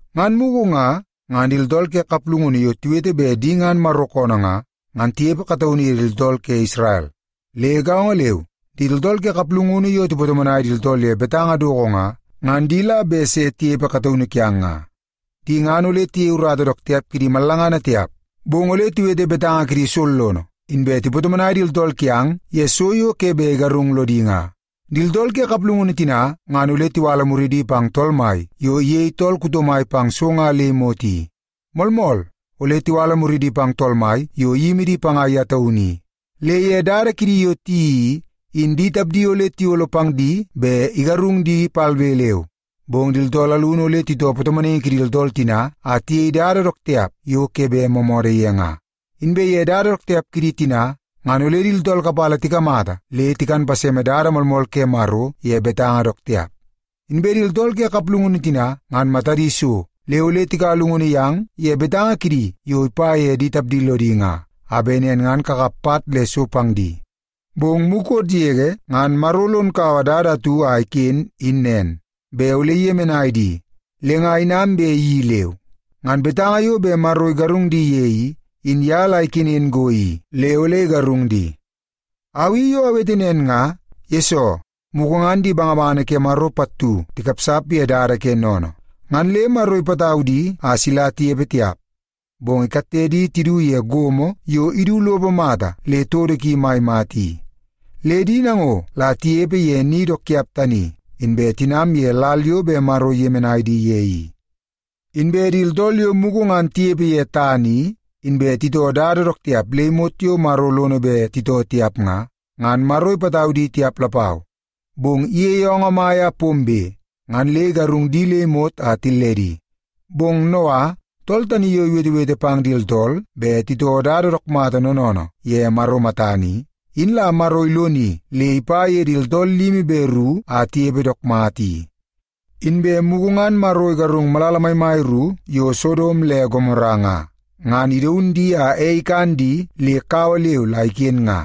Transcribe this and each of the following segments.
Ngan mugu nga, ngan di tooltool ke kaplungunu yo tiwete bet di ngan Maro koonoo nga, ngan tinepe kataunu ye di tooltool ke Isrel. Le gaongo leu, di tooltool ke kaplungunu yo tipatomonai di tooltool ye betanga doko nga, ngan di la bet se tinepe kataunu kiang nga. Di ngan ole tiyei urata dook tiap kidi mallangana tiap, bong ole tiwete betanga kidi sollono, inbe tipatomonai di tooltool kiang ye so yo ke bet igarung lodi nga. Di tooltool ke kaplungunu tina ngan ole tiwala muridi pang Tool Mai yo iyei tool kuto mai pang so nga le imot i. Moolmool, ole tiwala muridi pang Tool Mai yo iyimi di panga ye taunu i. Le ye dada kidi yo tiyeii i, in di tapdi ole tiyolo pang di bet igarung di palbe leu. Bong di tooltool alunu ole titoo patomonaingi kidi tooltool tina a tiyei dada dook tiap yo ke bet moomoodoo ye nga. Inbe ye dada dook tiap kidi tina, ngan ole di tooltool kapala tikamata le tikan paseme dada moolmool ke Maro ye betanga dook tiap. Inbe di tooltool ke kaplungunu tina ngan matadi so, le ole tikaua llungunu yang ye betanga kidi yo ipa ye di tapdi lodi nga, a bet nen ngan kakap pat le so pang di. Bong mukot yege ngan Maro lon kaua dada atu a iken in nen, bet ole iyemenai di, le nga inam bet iyeii leu. Ngan betanga yo bet Maro igarung di ye i, in ye la ikenen go i le ole igarung di. Au i yo awete nen nga, yesoo mugu ngan di bangabangana ke Maro pattu tikapsap ye dada ke sennene, ngan le Maro ipatau di a sila tinepe tiap. Bong ikatte di tidu ye gomo yo idu lopo mata le todo ki mai mata i. Le di nango la tinepe ye ni dook tiap tani, inbe tinam ye lal yo bet Maro iyemenai di ye i. Inbe di tooltool yo mugu ngan tinepe ye tana i, inbe titoo dada dook tiap le imot yo Maro lono bet titoo tiap nga, ngan Maro ipatau di tiap lapau. Bong iyeie oongoo mai a pombe, ngan le igarung di le imot a tilledi. Bong Noa, tool tani yo iwetewete pang di tooltool bet titoo dada dook mata noonoonoo ye Maro matana i, in la Maro iloni le ipa ye di tooltool limi be ru a tinepe dook mata i. Inbe mugu ngan Maro igarung malala maimai ru yo Sodom le Gomora nga, ngan idaun di a ei ikan di le kawa leu la iken nga.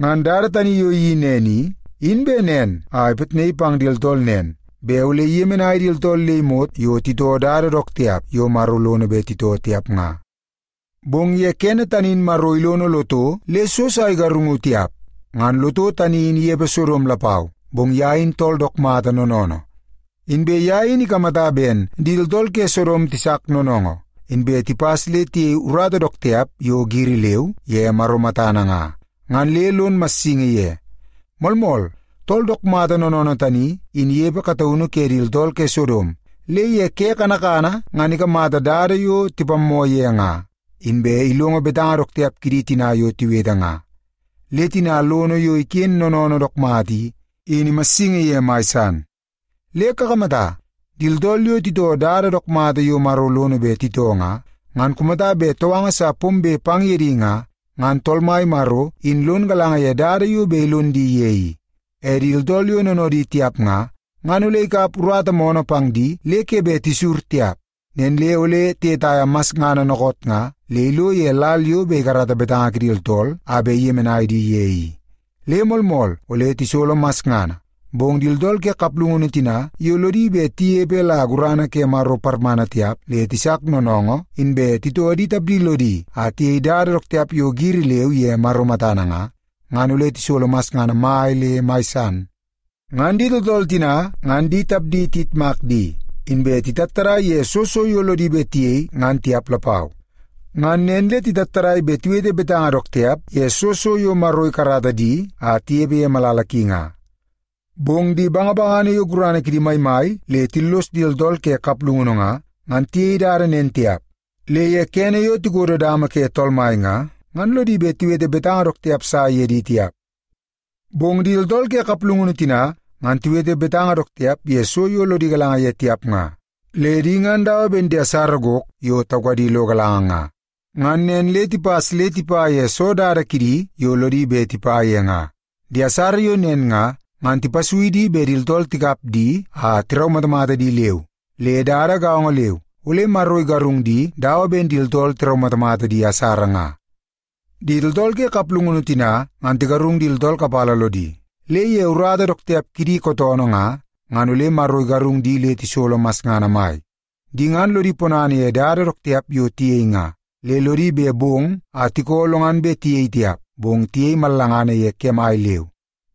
Ngan dada tani yo iyeii nen i, in bet nen a ipitnaii pang di tooltool nen, bet ole iyemenai di tooltool le imot yo titoo dada dook tiap yo Maro lono bet titoo tiap nga. Bong ye kene tani in Maro ilono Loto le so sa igarungu tiap. Ngan Loto tani in inepe Sodom lapau, bong ye in tool dook mata noonoonoo. Inbe ye in ikamata ben di tooltool ke Sodom tisak noonoongoo, inbe tipas le tiyei urata dook tiap yo giri leu ye Maro matana nga, ngan le lon massingi ye. Moolmool, tool dook mata noonoonoo tani, in inepe kataunu ke di tooltool ke Sodom, le ye ke kanakana ngan ikamata dada yo tipammoo ye nga, inbe ilongo betanga dook tiap kidi tina yo tiwete nga. Le tina lono yo iken noonoonoo dook mata i, in imassingi ye mai san. Le kakamata, di tooltool yo titoo dada dook mata yo Maro lono bet titoo nga, ngan kumata bet touanga sa pombe pang ye di nga, ngan Tool Mai Maro in lon galanga ye dada yo bet ilon di ye i. E di tooltool yo noonoodi tiap nga, ngan ole ikap urata moonoo pang di le ke bet tisur tiap. Nen le ole tiyetaia masngana dookoot nga le ilo ye lal yo bet ikarata betanga kidi tooltool a bet iyemenai di ye i. Le moolmool ole tisolo masngana, bong di tooltool ke kaplungunu tina yo lodi bet tinepe la gurana ke Maro parmana tiap le tisak noonoongoo inbe titoo di tapdi lodi a tiyei dada dook tiap yo giri leu ye Maro matana nga, ngan ole tisolo masngana mai le mai san. Ngan di tooltool tina ngan di tapdi tiyitmak di, inbe titattadai ye soo so yo lodi bet tiyei ngan tiap lapau. Ngan nen le titattadai bet tiwete betanga dook tiap ye soo so yo Maro ikarata di a tinepe ye malala ki nga. Bong di bangabangana yo gurana kidi maimai le tillos di tooltool ke kaplungunu nga, ngan tiyei dada nen tiap. Le ye kene yo tikodo dama ke Tool Mai nga, ngan lodi bet tiwete betanga dook tiap sa ye di tiap. Bong di tooltool ke kaplungunu tina, ngan tiwete betanga dook tiap ye so yo lodi galanga ye tiap nga. Le di ngan dawa ben di asara gok yo taukadi lo galanga nga. Ngan nen le tipas le tipa ye soo dada kidi yo lodi bet tipa ye nga. Di asara yo nen nga, ngan tipasui di bet di tooltool tikap di a tiraumatamata di leu. Le dada gaongo leu, ole Maro igarung di dawa ben di tooltool tiraumatamata di asara nga. Di tooltool ke kaplungunu tina ngan tigarung di tooltool kapala lodi, le ye urata dook tiap kidi kootoonoo nga, ngan ole Maro igarung di le tisolo masngana mai. Di ngan lodi ponana ye dada dook tiap yo tiyei nga, le lodi bet bong a tiko lo ngan bet tiyei tiap, bong tiyei mallangana ye kemai leu.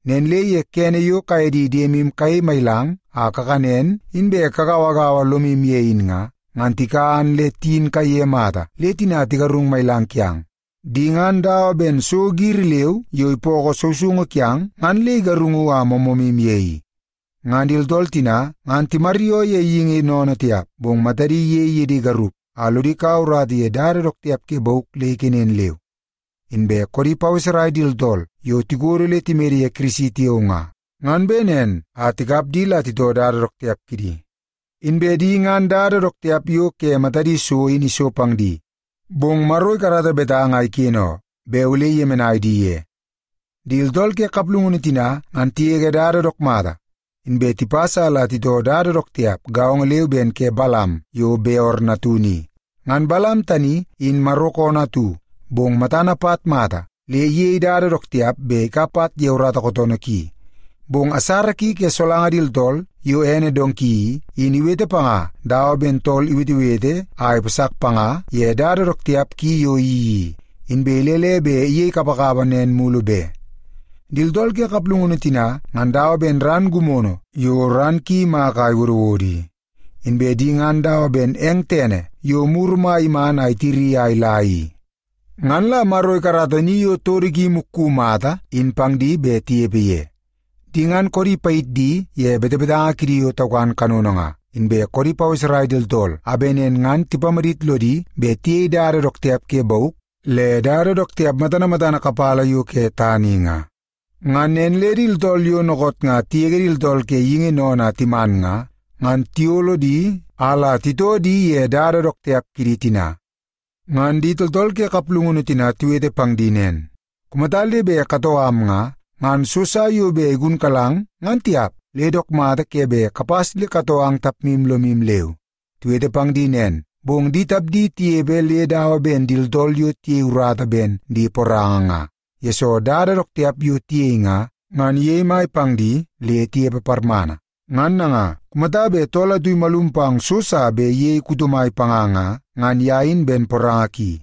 Nen le ye kene yo kaye di diemu kayei mailang a kakanen inbe kagauagaua lomu ye in nga, ngan tikan le tiyin kaiye mata le tina tigarung mailang kiang. Di ngan dawa ben so giri leu yo ipookoo sousoungu kiang ngan le igarungu a moomoomu ye i. Ngan di tooltool tina ngan timaryoo ye geingi sennene tiap, bong matadi iyei ye di garup a lodi kaua urata ye dada dook tiap ke bauk le ikenen leu. Inbe koodi paweserai di tooltool yo tikodo le timede ye Kirisi tiao nga, ngan bet nen a tikap di la titoo dada dook tiap kidi. Inbe di ngan dada dook tiap yo ke matadi so in iso pang di. Bong Maro ikarata betanga a iken oo, bet ole iyemenai di ye. Di tooltool ke kaplungunu tina ngan tigege dada dook mata, inbe tipas a la titoo dada dook tiap gaongo leu ben ke Balam yo Beor natunu i. Ngan Balam tani in Maro koonoo atu, bong matana pat mai mata, le iyei dada dook tiap bet ikap pat ye urata kootoonoo ki. Bong asara ki ke solanga di tooltool yo ene donki i, in iwete panga dawa ben tool iwetewete nga a ipasak panga ye dada dook tiap ki yo iyeii i, inbe ilele bet iyei kapakapa nen mulu be. Di tooltool ke kaplungunu tina ngan dawa ben ran gimono yo ran ki imaka a iwodowodo i. Inbe di ngan dawa ben eng tene yo muru mai iman ngan itiri a ila i. Ngan la Maro ikarata ni yo todo ki imukku mata in pang di a bet tinepe ye. Di ngan koodi payit di ye betebetanga kidi yo taukan kanono nga, inbe koodi paweserai di tooltool a bet nen ngan tipamadit lodi bet tiyei dada dook tiap ke bauk, le dada dook tiap matana matana kapala yo ke tana i nga. Ngan nen le di tooltool yo dookoot nga tigege di tooltool ke geingi sennene a timan nga, ngan tiyolo di a la titoo di ye dada dook tiap kidi tina. Ngan di tooltool ke kaplungunu tina tiwete pang di nen, “Kumata le bet katoo am nga, ngan so sa yo bet igunkalang ngan tiap, le dook mata ke bet kapas le katoo ang tapmu lomu leu.” Tiwete pang di nen, bong di tapdi tinepe le dawa ben di tooltool yo tiyei urata ben di poranga nga, yesoo dada dook tiap yo tiyei nga, ngan iyei mai pang di le tinepe parmana. Ngan nanga, kumata bet tool atu imalum pang so sa bet iyei kuto mai panga nga, ngan ye in ben poranga ki.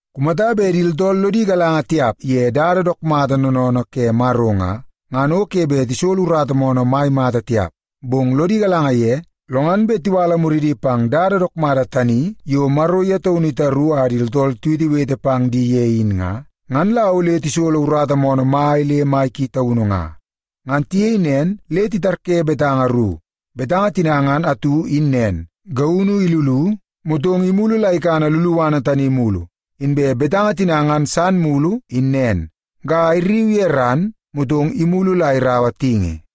Kumata bet di tooltool lodi galanga tiap ye dada dook mata noonoonoo ke Maro nga, ngan o ke bet tisolo urata moonoo mai mata tiap. Bong lodi galanga ye, lo ngan bet tiwala muridi pang dada dook mata tani yo Maro ye taunu itaru a di tooltool tiwetewete pang di ye in nga, ngan la ole tisolo urata moonoo mai le mai ki taunu nga. Ngan tiyei nen le itarye betanga ru. Betanga tina ngan atu in nen, “Gaunu ilulu, motong imulu la ikana luluana tani mulu.” Inbe betanga tina ngan san mulu in nen, “Ga irriu ye ran, motong imulu la iraua tingi.”